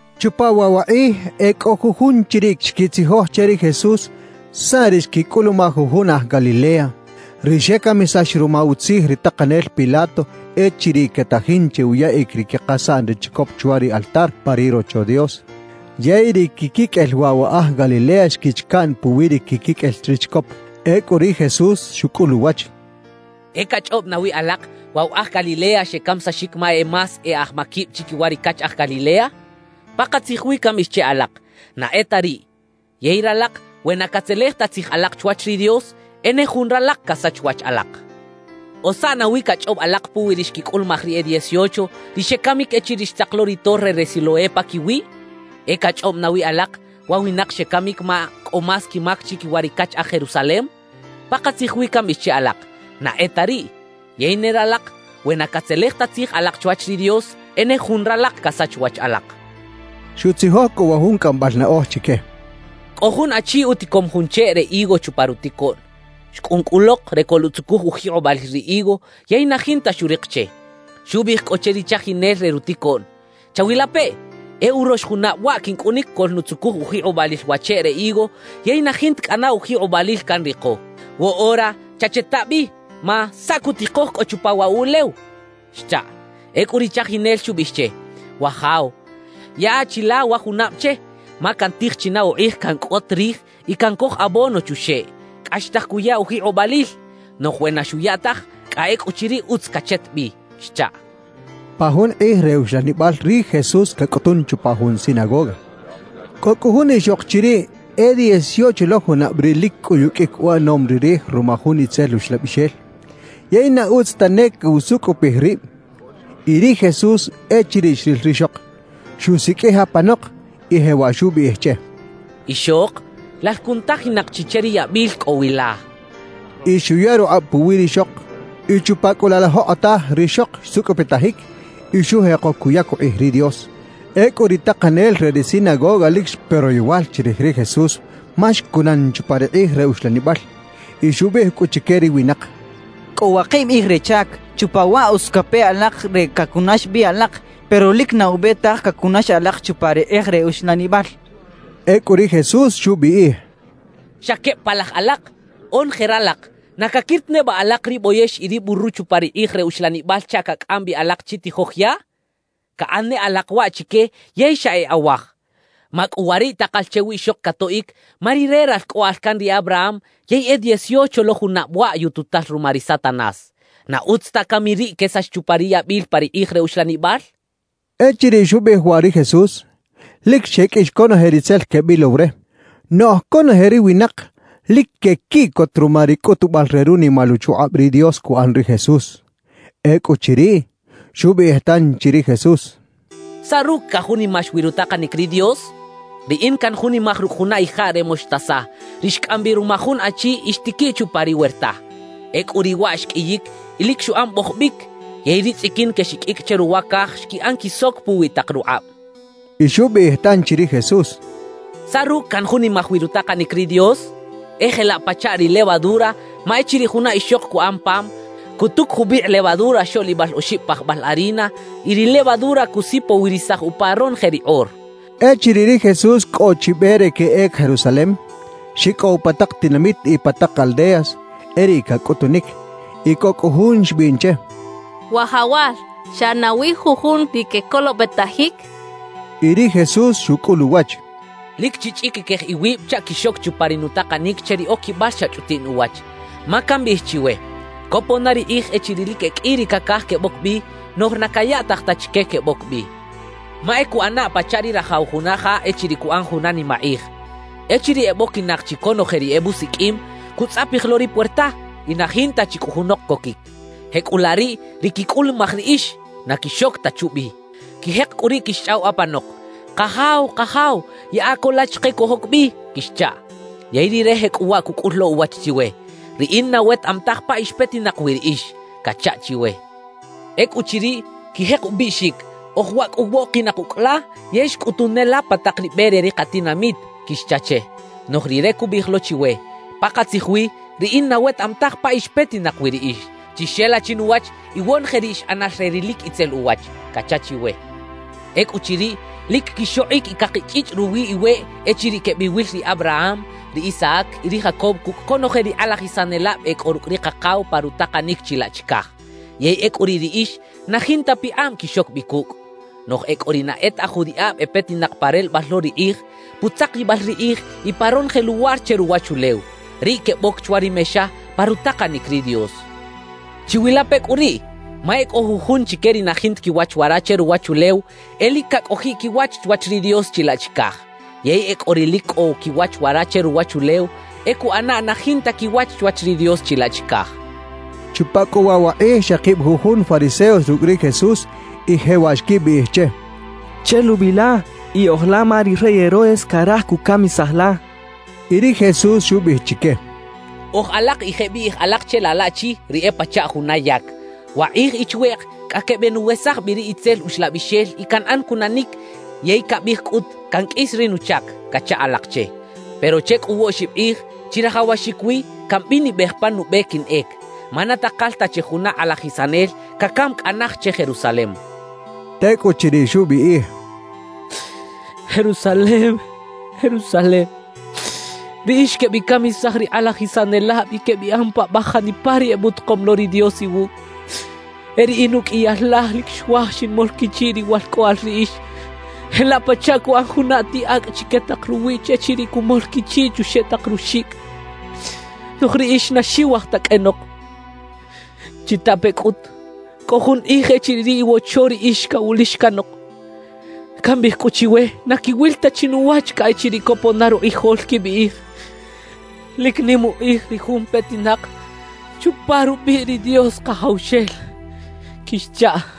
Chupa waꞌ wa qꞌij e kꞌo jujun chiriꞌ xkitzijoj che ri Jesús saꞌ ri xkikꞌulumaj jujun aj Galilea, ri xekamisax ruma utzij ri taqanel Pilato echiriꞌ ketajin che uyaꞌik ri kiqasaꞌn re chikop chwa ri altar pa ri Rocho Dios. Yey ri kikikꞌel waꞌ wa aj Galilea xkich kaꞌn puwi ri kikikꞌel ri chikop. Ekꞌu ri Jesús xukꞌul uwach: —¿E kachꞌobꞌ nawi alaq, waꞌ wa aj Galilea xekamisaxik ma e más e aj makibꞌ chikiwa ri kach aj Galilea? Paqatzij wi kambꞌiꞌij che alaq, na e ta riꞌ. Yey ralaq, we na katzelej ta tzij alaq chwach ri Dios, e ne jun ralaq kasach wach alaq. »¿O saꞌ nawi kachꞌobꞌ alaq puwi ri xkikꞌulumaj ri e dieciocho, ri xekamik echiriꞌ xtzaq lo ri Torre re Siloé pakiwiꞌ? ¿E kachꞌobꞌ nawi alaq, wa winaq xekamik ma kꞌo más kimak chikiwa ri kach aj Jerusalem? Paqatzij wi kambꞌiꞌij che alaq, na e ta riꞌ. Yey ne ralaq, we na katzelej ta tzij alaq chwach ri Dios, e ne jun ralaq kasach wach alaq —xchaꞌ. Xutzijoj kꞌu wa jun kꞌambꞌal naꞌoj chike: «Kꞌo jun achi utikom jun cheꞌ re higo chupa rutikoꞌn. Xkꞌun kꞌu loq re koluꞌtzukuj ujiqꞌobꞌalil ri higo yey na jinta xuriq che. Xubꞌiꞌij kꞌu che ri chajinel re rutikoꞌn: “Chawilapeꞌ, e urox junabꞌ waꞌ kinkꞌunik koꞌlnutzukuj ujiqꞌobꞌalil wa cheꞌ re higo, yey na jinta kꞌana ujiqꞌobꞌalil kanriqo. Woꞌora chacheta bꞌi ma ¿saꞌ kutiqoj kꞌo chupa waꞌ wuꞌlew?” xchaꞌ. Ekꞌu ri chajinel xubꞌiꞌij che: “Wajaw, yaꞌa chi la wa junabꞌ che, ma kantij chi na uqꞌij kankꞌot rij y kankoj abono chuxeꞌ. Kꞌaxtaj kuya ujiqꞌobꞌalil; noꞌj we na xuya taj, kꞌa ekꞌuchiriꞌ utz kachet bꞌi” xchaꞌ.» Pa jun qꞌij re uxlanibꞌal ri Jesús kakꞌutun chupa jun sinagoga. Kꞌo kꞌu jun ixoq chiriꞌ e dieciocho lo junabꞌ riꞌ lik kꞌuyukꞌik uꞌanom ri rij ruma jun itzel uxlabꞌixel, yey na utz ta ne kusukꞌupij ribꞌ. Y ri Jesús echiriꞌ xril rixoq, xusikꞌij apanoq y jewaꞌ xubꞌiꞌij che: —Ixoq, lal kunutajinaq chi che ri yabꞌil kꞌo wi la —xchaꞌ. Y xuya ruqꞌabꞌ puwi rixoq; y chupa kꞌu laꞌ la joqꞌotaj rixoq xsukꞌupitajik y xujeqo kuyak uqꞌij ri Dios. Ekꞌu ri taqanel re ri sinagoga lik xpe royowal chirij ri Jesús ma xkunan chupa ri qꞌij re uxlanibꞌal, y xubꞌiꞌij kꞌu chike ri winaq: —Kꞌo waqibꞌ qꞌij re chak; chupa waꞌ utz kape alaq re kakunax bꞌi alaq, pero lik na ubꞌe taj kakunax alaq chupa ri qꞌij re uxlanibꞌal —xchaꞌ. Ekꞌu ri Jesús xubꞌiꞌij: —¡Xa kebꞌ palaj alaq! Onoje ralaq ¿na kakir ta nebꞌa alaq ri bꞌoyex y ri buru chupa ri qꞌij re uxlanibꞌal chaꞌ kakꞌam bꞌi alaq chi tijoj yaꞌ? Kaꞌan ne alaq waꞌ chike yey xa e awaj. Makꞌuwariꞌ taqal che wiꞌxoq katoꞌik, ma rire ralkꞌoꞌal kan ri Abraham, yey e dieciocho lo junabꞌ waꞌ “yututal” ruma ri Satanás. ¿Na utz ta kami riꞌ kesax chupa ri yabꞌil pa ri qꞌij re uxlanibꞌal? —xchaꞌ. Echiriꞌ xubꞌiꞌij waꞌ ri Jesús, lik xekꞌix konoje ri tzel kebꞌilow re; noꞌj konoje ri winaq lik kekiꞌkot ruma ri kꞌutubꞌal re runimal uchuqꞌabꞌ ri Dios kuꞌan ri Jesús. Ekꞌuchiriꞌ, xubꞌiꞌij tanchi ri Jesús: «¿Saꞌ rukꞌ kajunimax wi rutaqanik ri Dios? Riꞌin kanjunimaj rukꞌ juna ijaꞌ re moxtasa, ri xkꞌam bꞌi ruma jun achi y xtikiꞌ chupa ri werta. Ekꞌu riꞌ waꞌ xkꞌiyik y lik xuꞌan bꞌojobꞌik; yey ri tzꞌikin kexikꞌikꞌ che ruwa kaj xkiꞌan kisok puwi taq ruqꞌabꞌ» xchaꞌ. Y xubꞌiꞌij tanchi ri Jesús: «¿Saꞌ rukꞌ kanjunimaj wi rutaqanik ri Dios? E jelaꞌ pachaꞌ ri levadura, ma echiriꞌ juna ixoq kuꞌan pam, kutuk jubꞌiqꞌ levadura xoꞌlibꞌal oxibꞌ pajbꞌal harina y ri levadura kusipowirisaj upa ronoje ri qꞌor» xchaꞌ. Echiriꞌ ri Jesús kꞌo chi bꞌe re keꞌek Jerusalem, xikꞌow pa taq tinamit y pa taq aldeas, e riꞌ kakꞌutunik. Y kꞌo kꞌu jun xbꞌiꞌn che: —Wajawal, ¿xa nawi jujun ri kekolobꞌetajik? —xcha che. Y ri Jesús xukꞌul uwach: «Lik chichꞌikikej iwibꞌ chaꞌ kixok chupa ri nutaqanik che ri okibꞌal xa chꞌutiꞌn uwach, ma kambꞌiꞌij chiwe: Kopon na ri qꞌij echiriꞌ lik e kꞌi ri kakaj kebꞌok bꞌi, noꞌj na kayaꞌtaj ta chike kebꞌok bꞌi. »Ma e kuꞌana pachaꞌ ri rajaw juna ja echiriꞌ kuꞌan juna nimaqꞌij. Echiriꞌ ebꞌokinaq chi konoje ri ebꞌusikꞌim, kutzꞌapij lo ri puerta, y na jinta chi kꞌu junoq kokik. Jekꞌulaꞌ riꞌ ri kikꞌulumaj riꞌix, na kixok ta chubꞌi. Kijeq kꞌu riꞌ kixchꞌaw apanoq: “Qajaw, Qajaw, yaꞌa ko la chiqe kojok bꞌi” kixchaꞌ. »Yey Rire jekꞌuwaꞌ kukꞌul lo uwach chiwe: “Riꞌin na wetaꞌam taj pa ix petinaq wi riꞌix” kacha chiwe. »Ekꞌuchiriꞌ, kijeq ubꞌiꞌxik: “Oj waꞌ kꞌu woꞌqinaq ukꞌ la yey xkꞌutun ne la pa taq ri bꞌe re ri qatinamit” kixcha che. »Noꞌj Rire kubꞌiꞌij lo chiwe: “Paqatzij wi, riꞌin na wetaꞌam taj pa ix petinaq wi riꞌix. Chixela chinuwach, iwonoje ri ix ꞌanal re ri lik itzel uwach” kacha chiwe. »Ekꞌuchiriꞌ, lik kixoqꞌik y kaqichꞌichꞌ ruwi iweꞌ echiriꞌ kebꞌiwil ri Abraham, ri Isaac y ri Jacob kukꞌ konoje ri qꞌalajisanelabꞌ e kꞌo rukꞌ ri Qaqaw pa rutaqanik chilaꞌ chikaj; yey ekꞌu riꞌ riꞌix na jinta piqꞌabꞌ kixok bꞌi kukꞌ. Noꞌj e kꞌo ri na e ta aj judiꞌabꞌ e petinaq pa relebꞌal lo ri qꞌij, putzaqibꞌal ri qꞌij y pa ronoje luwar che ruwachulew, riꞌ kebꞌok chwa ri mexa pa rutaqanik ri Dios. »Chiwilape kꞌu riꞌ, ma e kꞌo jujun chike ri na jinta kiwach wara che ruwachulew, e lik kakꞌojiꞌ kiwach chwach ri Dios chilaꞌ chikaj; yey e kꞌo ri lik kꞌo kiwach wara che ruwachulew, e kuꞌana na jinta kiwach chwach ri Dios chilaꞌ chikaj» xchaꞌ. Chupa kꞌu waꞌ wa qꞌij xeqibꞌ jujun fariseos rukꞌ ri Jesús y jewaꞌ xkibꞌiꞌij che: —Chelubꞌi la y oj la ma ri rey Herodes karaj kukamisaj la —xechaꞌ. Y ri Jesús xubꞌiꞌij chike: —Oj alaq y jeꞌbꞌiꞌij alaq che laꞌ laꞌchi, ri e pachaꞌ juna yak: “Waqꞌij y chweꞌq kꞌa kebꞌenuwesaj bꞌi ri itzel uxlabꞌixel y kanꞌan kunanik yey kabꞌij kꞌut kankꞌis ri nuchak” kacha alaq che. Pero che kꞌu woꞌxibꞌ qꞌij chirajawaxik wi kambꞌinibꞌej pan nubꞌe kinꞌek, ma na taqal ta che juna qꞌalajisanel kakam kꞌa naj che Jerusalem —xchaꞌ. Tekꞌuchiriꞌ xubꞌiꞌij: «¡Jerusalem, Jerusalem, riꞌix kebꞌikamisaj ri qꞌalajisanelabꞌ y kebꞌiꞌan paꞌbꞌaj janipa ri ebꞌutaqom lo ri Dios iwukꞌ! E riꞌin ukꞌiyal laj lik xuaj xinmol kichiꞌ riwalkꞌoꞌal riꞌix jelaꞌ pachaꞌ kuꞌan juna atiꞌ akꞌ chike taq ruwiꞌch echiriꞌ kumol kichiꞌ chuxeꞌ taq ruxikꞌ, noꞌj riꞌix na xiwaj ta kꞌenoq. »Chitape kꞌut, kꞌo jun qꞌij echiriꞌ ri iwocho riꞌix kawulix kanoq. Kambꞌiꞌij kꞌu chiwe na kiwil ta chi nuwach kꞌa echiriꞌ kopon na ruqꞌijol kibꞌiꞌij: Lik nim uqꞌij ri jun petinaq chupa rubꞌiꞌ ri Dios Qajawxel kixchaꞌ.»